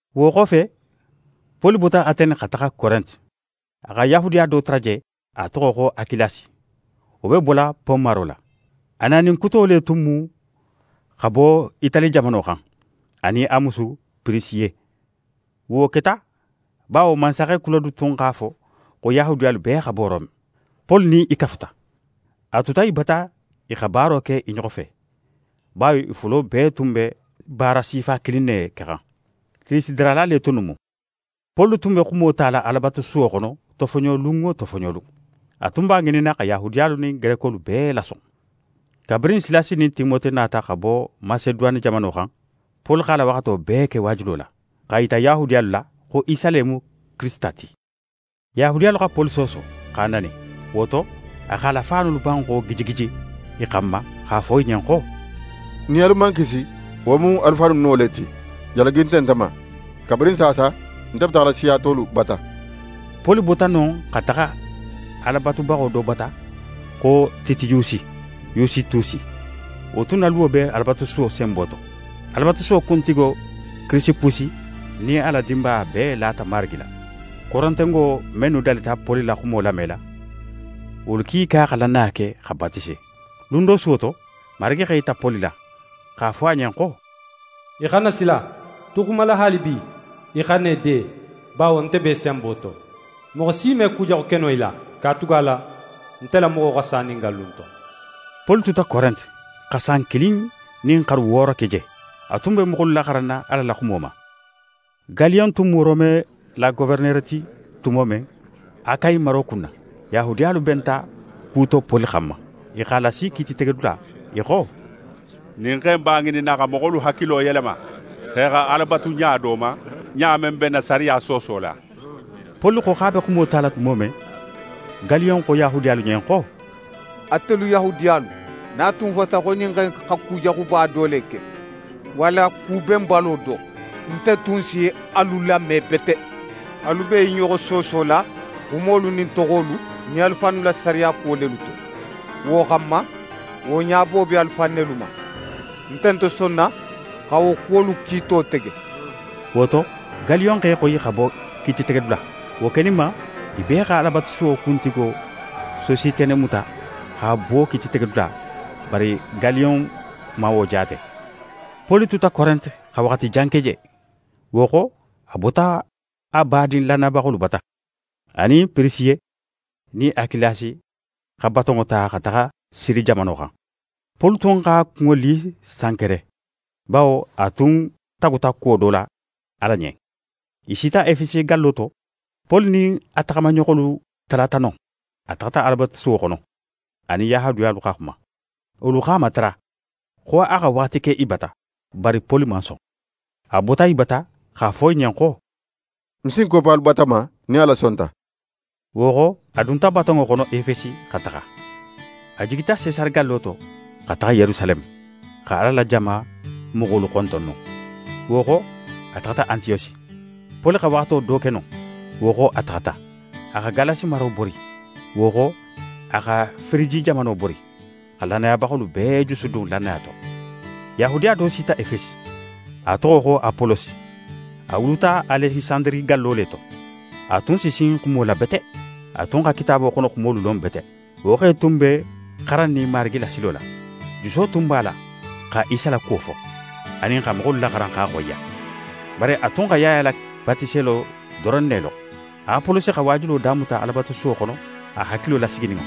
Wo xofe, Poli bota Atene xa taxa Korente. A xa Yahudiya do tara je, a toxo xo Akilasi. Wo be bola Pon maro la. A nanin kuto le tun mu xa bo Itali jamano xan, a nin a musu Pirisiye. Wo keta bawo mansaxe Kulode tun x'a fo xo Yahudiyalu bee xa bo Rome. Poli nin i kafuta. A tuta i bata i xa baaro ke i ɲoxo fe, bawo i fulo bee tun be baara sifa kilin ne kexan. Tillisidarala le tunnu mu. Poli tun be xumo tala Alabatusuwo xono, tofoɲolun wo tofoɲolun. A tun b'a ŋininna xa Yahudiyalu nin Gerekolu bee lason. Kabirin Silasi nin Timote nata xa bo Maseduwane jamano xan, Poli x'a la waxato bee ke waajulo la, x'a yita Yahudiyalu la xo Isa le mu Kirisita ti. Yahudiyalu xa Poli sooso, x'a nani. Wo to, a x'a la faanolu banxo gijigiji i xanma x'a fo i ɲen xo: «Nin alu man kisi, wo mu alu fannu no le ti. Jalagi nte nte ma. Kabirin saasa, nte be taxala siya tolu bata.» Poli bota non xa taxa Ala batubaxo do bata xo Titiyusi Yusitusi. Wo tun na luwo be Alabatusuwo senbo to. Alabatusuwo kuntigo Kirisipusi nin a la dinbaya bee lata Marigi la. Korentengo mennu dalita Poli la xumo lamela, wolu kiika xa lannaya ke xa batise. Lun do suwo to, Marigi x'é yita Poli la, x'a fo a ɲen xo: «Í xana sila. Tu xumala haalibi, í xana í de, bawo nte be í senbo to. Moxo si me kujaxu ke no í la, katugala nte la moxo xa sa ɲin gallu in to.» Poli tuta Korente xa san kilin nin xaru wooro ke je. A tun be moxolu laxaranna Ala la xumo ma. Galiyon tun mu Rome la goferenere ti tumo men, Akayi maro kunna, Yahudiyalu benta ku to Poli xanma. I x'a lasi kiititegedula. I xo: «Ɲin xe in b'a ŋininna xa moxolu hakilo yelema, xo i xa Ala batu ɲa do ma, ɲa men be n na sariya soosola.» Poli xo x'a be xumo tala tumo men, Galiyon xo Yahudiyalu ɲen xo: «Atelu Yahudiyalu, nin a tun fota xo ɲin xe in xa kujaxuba do le ke walla ku benbalo do, nte tun si alu lame bete. Alu be i ɲoxo soosola xumolu nin toxolu nin alu fannu la sariya kuwo lelu to, wo xanma, wo ɲabo be alu fan nelu ma. Nte nte sonna xa wo kuwolu kiito tege.» Wo to, Galiyon x'e xoyi xa bo kiititegedula. Wo keninma, i bee xa Alabatusuwo kuntigo Sositene muta x'a buwo kiititegedula, bari Galiyon man wo jaate. Poli tuta Korente xa waxati jan ke je. Wo xo, a bota badin lannayabaxolu bata. A nin Pirisiye nin Akilasi xa batonŋo ta xa taxa Siri jamano xan. Poli tun x'a kunŋo li Sankere, bawo a tun taguta kuwo do la Ala ɲen. I sita Efesi gallo to. Poli nin a taxamaɲoxolu talata non. A taxata Alabatusuwo xono, a nin Yahudiyalu xa xuma. Wolu x'a matara xo a xa waxati ke i bata, bari Poli man son. A bota i bata, x'a fo i ɲen xo: «Ń si ń koppa alu bata ma, nin Ala sonta.» Wo xo, a dunta batonŋo xono Efesi xa taxa. A jigita Sesare gallo to, xa taxa Yerusaleme, xa Ala la jama moxolu xonton non. Wo xo, a taxata Antiyosi. Poli xa waxato do ke non, wo xo, a taxata. A xa Galasi maro bori, wo xo, a xa Firiji jamano bori, xa lannayabaxolu bee jusudun lannaya to. Yahudiya do sita Efesi. A toxo xo Apolosi. A wuluta Alekisandiri gallo le to. A tun si sin xumo la bete. A tun xa Kitaabo xono xumolu lon bete. Wo xe tun be xarannin Marigi la silo la. Juso tun b'a la xa Isa la kuwo fo, anin xa moxolu laxaran x'a xoyiya. Bari a tun xa Yaya la batiselo doron ne lon. Apolosi xa waajulo damuta Alabatusuwo xono a hakilo lasigininŋo.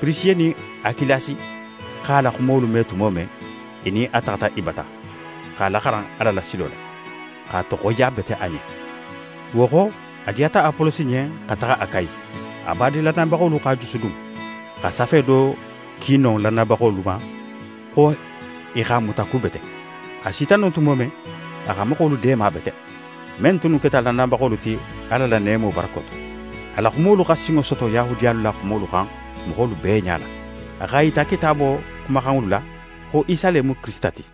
Pirisiye nin Akilasi x'a la xumolu me tumo men, i nin a taxata i bata, x'a laxaran Ala la silo la, x'a toxoyiya bete a ɲen. Wo xo, a diyata Apolosi ɲen xa taxa Akayi. A badin lannayabaxolu x'a jusudun, xa safe do ki non lannayabaxolu ma xo i x'a mutakubete. A sita non tumo men, a xa moxolu deema bete, men tunnu keta lannayabaxolu ti Ala la neemo barako to. A la xumolu xa sinŋo soto Yahudiyalu la xumolu xan moxolu bee ɲala. A x'a yita Kitaabo xumaxanŋolu la, xo Isa le mu Kirisita ti.